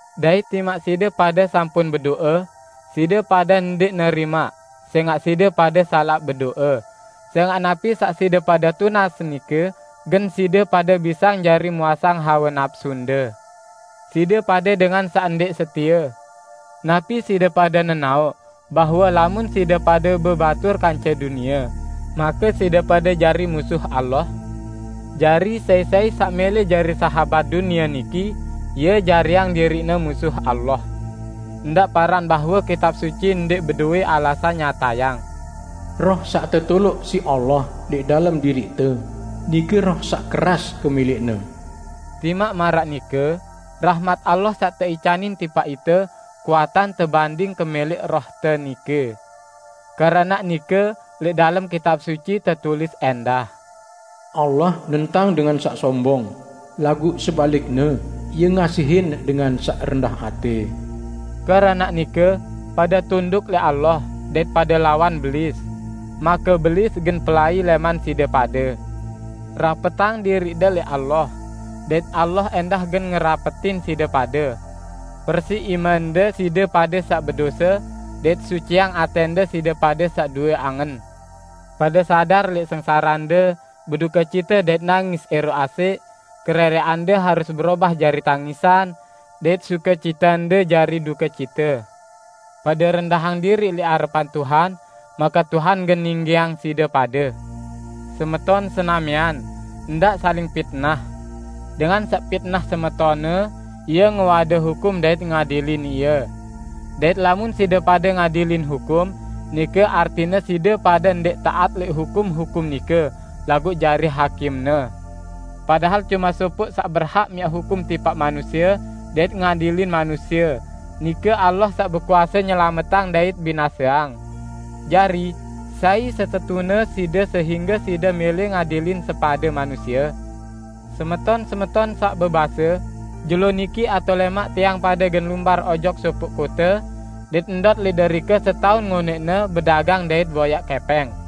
Dait timaq side pade sampun bedo'e, side pade ndẽq nerimaq, sẽngaq side pade salaq bedo'e, sẽngaq napi saq side pade tunas nike gen side pade bisang jari muasang hawe napsunde. Side pade dengan saq ndẽq setie! Napi side pade nenaoq bahwe lamun side pade bebatur kance dunie, make side pade jari musuh Allah? Jari, sai-sai saq mẽlẽ jari sahabat dunie niki, ie jariang diriqne musuh Allah. Ndaq paran bahwe Kitab Suci ndẽq bedowẽ alasan nyatayang, "Roh saq tetoloq siq Allah lẽq dalem diriqte, nike roh saq keras kemẽlẽqne." Timaq maraq nike, rahmat Allah saq teicanin tipaq ite kuatan tebanding kemẽlẽq rohte nike. Keranaq nike lẽq dalem Kitab Suci tetulis ẽndah, "Allah nentang dengan saq sombong, laguq sebalikne Ie ngasihin dengan saq rendah atẽ." Keranaq nike, pade tunduk lẽq Allah dait pade lawan Belis, make Belis gen pelai lẽman side pade. Rapetang diriqde lẽq Allah, dait Allah ẽndah gen ngerapetin side pade. Persiq imende, side pade saq bedose! Dait suciang atẽnde, side pade saq due angen! Pade sadar lẽq sengsarende, bedukecite dait nangis ẽroq asẽq; kerẽrẽqande harus berobah jari tangisan, dait sukecitende jari dukecite! Pade rendahang diriq lẽq arepan Tuhan, make Tuhan gen ninggiang side pade. Semeton senamian, ndaq saling pitnah. Dengan saq pitnah semetonne, ie ngewade hukum dait ngadilin ie. Dait lamun side pade ngadilin hukum, nike artine side pade ndẽq taat lẽq hukum-hukum nike, laguq jari hakimne. Padahal cume sopoq saq berhak miaq hukum tipaq manusie dait ngadilin manusie, nike Allah saq bekuase nyelametang dait binaseang. Jari, sai setetune side sehingge side mẽlẽ ngadilin sepade manusie? Semeton-semeton saq bebase, "Jelo niki atao lẽmaq tiang pade gen lumbar ojok sopoq kote, dait ndot lẽq derike setaun ngonẽqne bedagang dait boyaq kẽpẽng."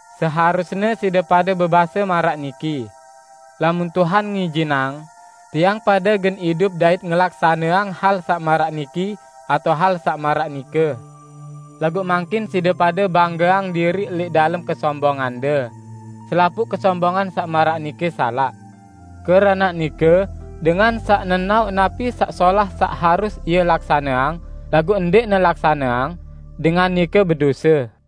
Seharusne side pade bebase maraq niki, "Lamun Tuhan ngijinang, tiang pade gen idup dait ngelaksaneang hal saq maraq niki atao hal saq maraq nike." Laguq mangkin side pade banggeang diriq lẽq dalem kesombongande, selapuq kesombongan saq maraq nike salaq. Keranaq nike, dengan saq nenaoq napi saq solah saq harus ie laksaneang laguq ndẽqne laksaneang, dengan nike bedose.